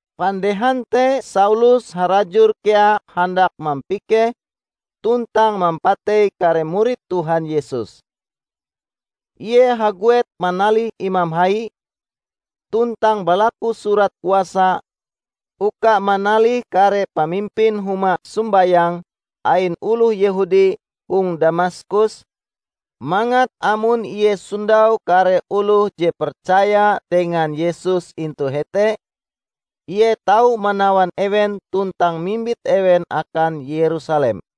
Pandehan te Saulus harajur kea handak mampikeh tuntang mampatei kare murid Tuhan Yesus. Ie haguet manalih imam hai, tuntang balaku surat kuasa uka manalih kare pamimpin huma sombayang ain oloh Yehudi hong Damaskus, mangat amon ie sondau kare oloh je percaya dengan Yesus intu hete, ie tau manawan ewen tuntang mimbit ewen akan Yerusalem.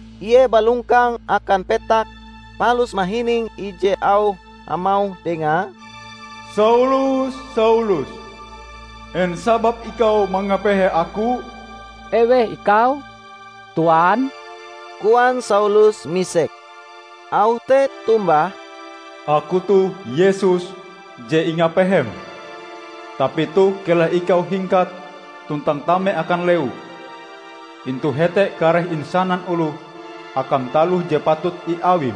Ie balongkang akan petak palus mahining ije auh hamauh dengae, "Saulus, Saulus! En sababe ikau mangapehe aku?" "Eweh ikau, Tuan?" koan Saulus misek. Auh te tombah, "Aku toh Yesus, je ingapehem. Tapi toh keleh ikau hingkat tuntang tame akan lewu. Intu hete kareh insanan oloh akam taloh je patut iawim."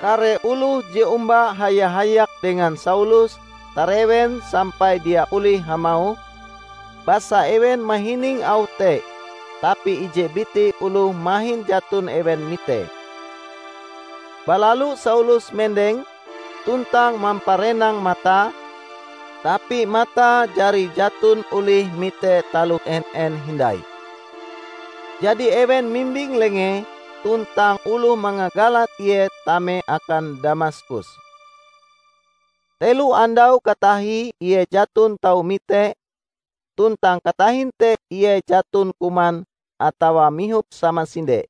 Kare oloh je omba haya-hayak dengan Saulus tarewen sampai dia olih hamauh; basa ewen mahining auh te tapi ije biti oloh mahin jaton ewen mitee. Balalu Saulus mendeng tuntang mamparenang matae tapi matae jari jaton olih mite taloh en-en hindai. Jadi ewen mimbing lengee tuntang oloh mangagalan ie tame akan Damaskus. Telo andau katahie ie jaton tau mite tuntang katahin te ie jaton kuman atawa mihop samasinde.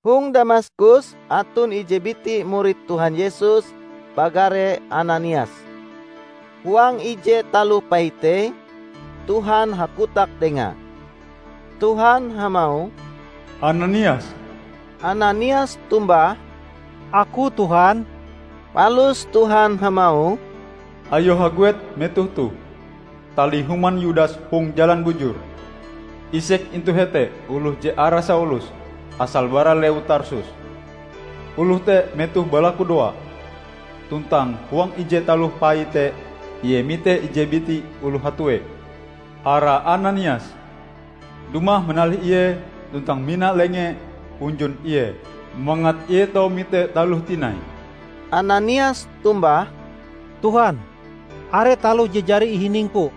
Hong Damaskus aton ije biti murid Tuhan Yesus bagare Ananias. Huang ije taloh paite, Tuhan hakotak dengae. Tuhan hamauh, "Ananias!" Ananias tombah, "Aku, Tuhan." Palus Tuhan hamauh, "Ayo haguet metoh toh. Talih human Yudas hong Jalan Bujur. Isek intu hete oloh je arae Saulus asale bara lewu Tarsus. Oloh te metohe balakudoa, tuntang huang ije taloh paite ie mite ije biti oloh hatue, arae Ananias, dumah manalih ie tuntang mina lengee hunjun ie mangat ie tau mite taloh tinai." Ananias tombah, "Tuhan, are taloh je jari ihiningku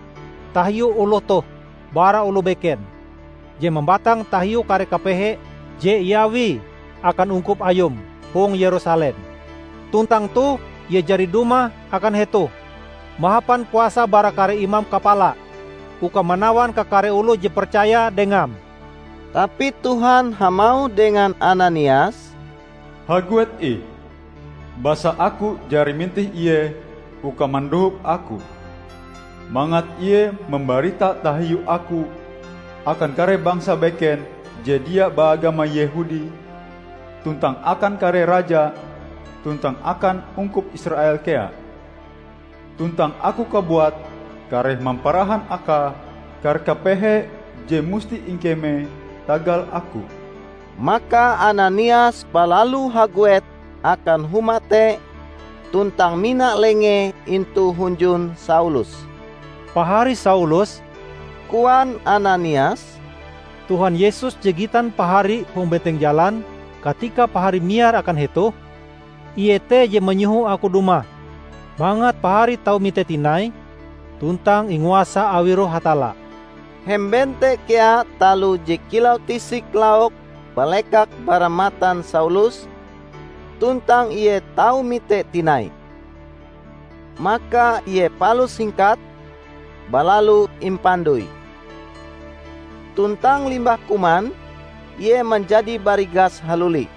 tahiu oloh toh bara oloh beken, je mambatang tahiu kare kapehe je iawie akan ungkup Ayum hong Yerusalem. Tuntang toh ie jari dumah akan hetoh mahapan kuasa bara kare imam kapala uka manawan kakare oloh je percaya Dengam." Tapi Tuhan hamauh dengan Ananias, "Haguet ih! Basa Aku jari mintih ie uka mandohop Aku, mangat ie mambarita tahiu Aku akan kare bangsa beken je dia baagama Yehudi tuntang akan kare raja tuntang akan ungkup Israel kea. Tuntang Aku kabuat kareh mamparahan akae kare kapehe je musti ingkemee tagal Aku." Maka Ananias balalu haguet akan huma te tuntang mina lengee intu hunjun Saulus. "Pahari Saulus," koan Ananias, "Tuhan Yesus je gitan pahari hong benteng jalan katika pahari miar akan hetoh, Ie te je manyoho aku dumah mangat pahari tau mite tinai tuntang inguasa awi Roh Hatalla." Hemben te kea taloh je kilau tisik lauk balekak bara matan Saulus tuntang ie tau mite tinai. Maka ie palus hingkat, balalu impandoi. Tuntang limbah kuman, ie manjadi barigas haluli.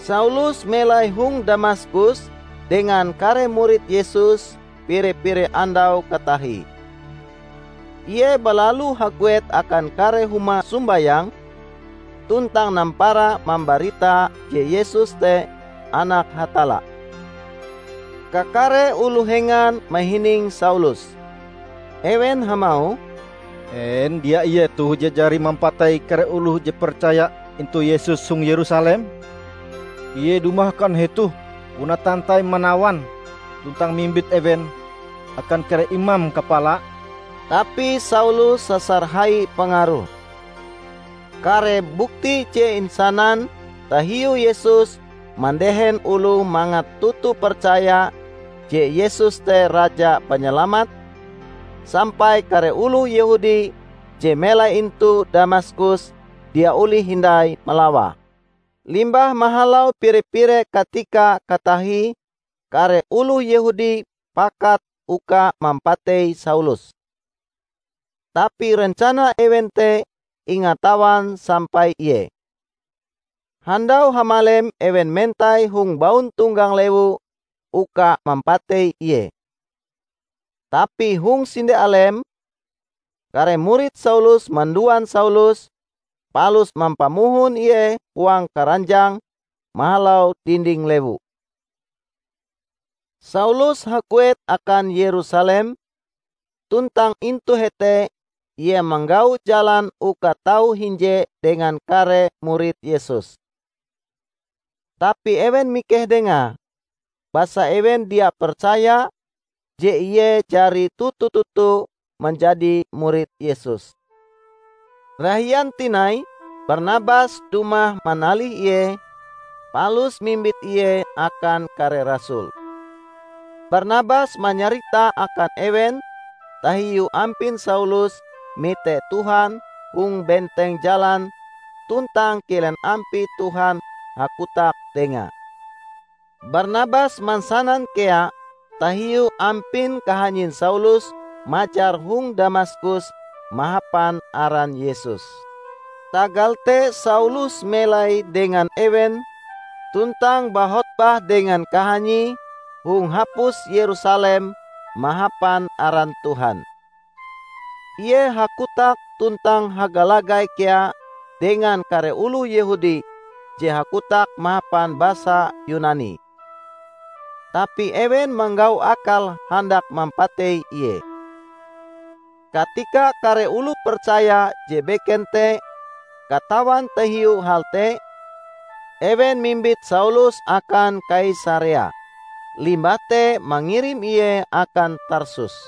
Saulus melai hong Damaskus dengan kare murid Yesus pire-pire andau katahie. Ie balalu haguet akan kare huma sombayang tuntang nampara mambarita je Yesus te Anak Hatalla. Kakare oloh hengan mahining Saulus. Ewen hamauh, "En dia ie toh je jari mampatei kare oloh je percaya intu Yesus hong Yerusalem? Ie dumah akan hetoh puna tantai manawan tuntang mimbit ewen akan kare imam kapala!" Tapi Saulus sasar hai pangaruhe. Kare bukti je insanan tahiu Yesus mandehen oloh mangat toto percaya je Yesus te Raja Panyalamat, sampai kare oloh Yehudi je melai intu Damaskus dia olih hindai malawae. Limbah mahalau pire-pire katika katahie kare oloh Yehudi pakat uka mampatei Saulus. Tapi rencana ewen te ingatawan sampai ie. Handau hamalem ewen mentai hong bauntonggang lewu uka mampatei ie. Tapi hong sinde alem, kare murid Saulus manduan Saulus, palus mampamohon ie huang karanjang mahalau dinding lewu. Saulus haguet akan Yerusalem, tuntang intu hete ie manggau jalan uka tau hinje dengan kare murid Yesus. Tapi ewen mikeh dengae, basa ewen dia percaya je ie jari toto-toto manjadi murid Yesus. Rahian tinai Barnabas dumah manalih ie, palus mimbit ie akan kare rasul. Barnabas manyarita akan ewen tahiu ampin Saulus mite Tuhan hong benteng jalan tuntang kilen ampie Tuhan hakotak dengae. Barnabas mansanan kea tahiu ampin kahanyin Saulus majar hong Damaskus mahapan aran Yesus. Tagal te Saulus melai dengan ewen tuntang bahotbah dengan kahanyie hong hapus Yerusalem mahapan aran Tuhan. Ie hakotak tuntang hagalagai kea dengan kare oloh Yehudi je hakotak mahapan basa Yunani. Tapi ewen manggau akal handak mampatei ie. Katika kare oloh percaya je beken te katawan tahiu hal te, ewen mimbit Saulus akan Kaisarea, limbah te mangirim ie akan Tarsus.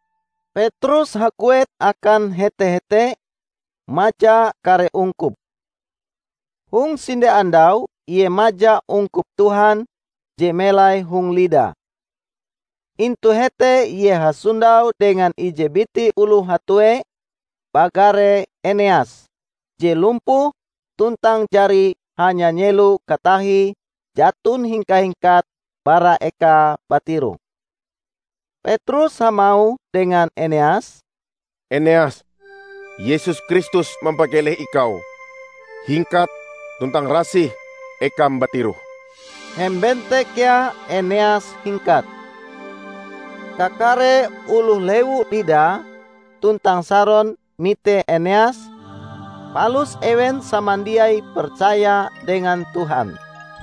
Petrus haguet akan hete-hete maja kare ungkup. Hong sinde andau ie maja ungkup Tuhan je melai hong Lida. Intu hete ie hasondau dengan ije biti oloh hatue bagare Eneas, je lumpuh tuntang jari hanya nyelo katahie jaton hingka-hingkat bara ekae batiroh. Petrus hamauh dengan Eneas, "Eneas, Yesus Kristus mampakeleh ikau. Hingkat tuntang rasih ekam batiroh." Hemben te kea Eneas hingkat. Kakare oloh lewu Lida tuntang Saron mite Eneas, palus ewen samandiai percaya dengan Tuhan.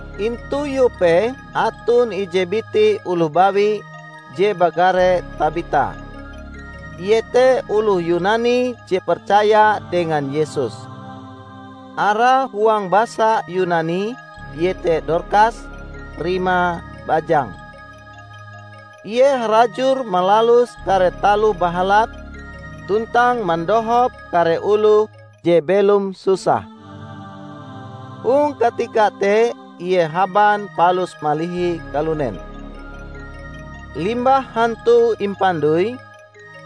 Intu Yope aton ije biti oloh bawi je bagare Tabita. Ie te oloh Yunani je percaya dengan Yesus. (Arae huang basa Yunani iete Dorkas rimae bajang.) Ie harajur malalus kare taloh bahalap tuntang mandohop kare oloh je belom susah. Hong katika te ie haban palus malihi kalunen. Limbah hantue impandoi,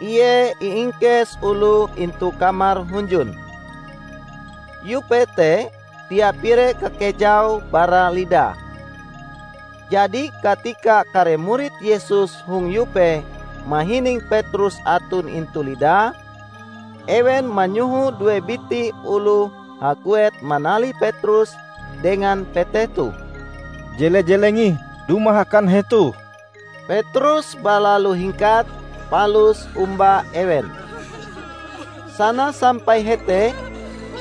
ie iingkes oloh intu kamar hunjun. Yope te dia pire kakejaue bara Lida. Jadi katika kare murid Yesus hong Yope mahining Petrus aton intu Lida, ewen manyoho due biti oloh haguet manalih Petrus dengan peteh toh, "Jele-jeleng ih dumah akan hetoh." Petrus balalu hingkat palus omba ewen. Sana sampai hete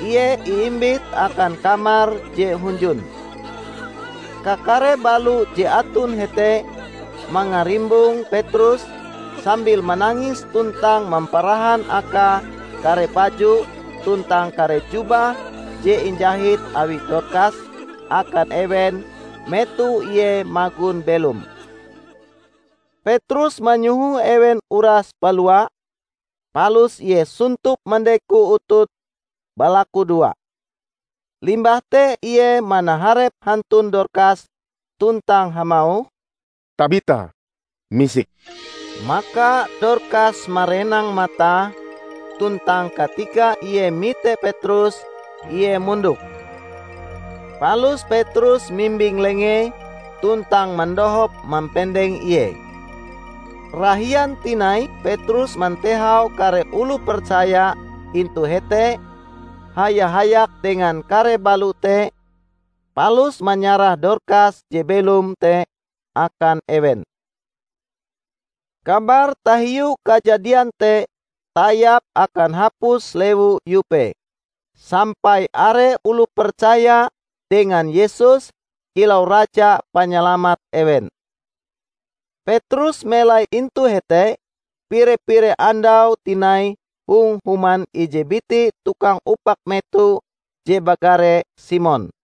ie iimbit akan kamar je hunjun. Kakare balo je aton hete mangarimbong Petrus sambil manangis tuntang mamparahan akae kare baju tuntang kare jubah je injahit awi Dorkas akan ewen metoh ie magon belom. Petrus manyoho ewen uras balua, palus ie sontop mandeko utute balakudoa. Limbah te ie manaharep hantun Dorkas tuntang hamauh, "Tabita, misik!" Maka Dorkas marenang matae, tuntang katika ie mite Petrus, ie mondok. Palus Petrus mimbing lengee tuntang madohop mampendeng ie. Rahian tinai Petrus mantehau kare oloh percaya intu hete haya-hayak dengan kare balo te, palus manyarah Dorkas je belom te akan ewen. Kabar tahiu kajadian te tayap akan hapus lewu Yope, sampai are oloh percaya dengan Yesus kilau Raja Panyalamat ewen. Petrus melai intu hete pire-pire andau tinai hong human ije biti tukang upak meto je bagare Simon.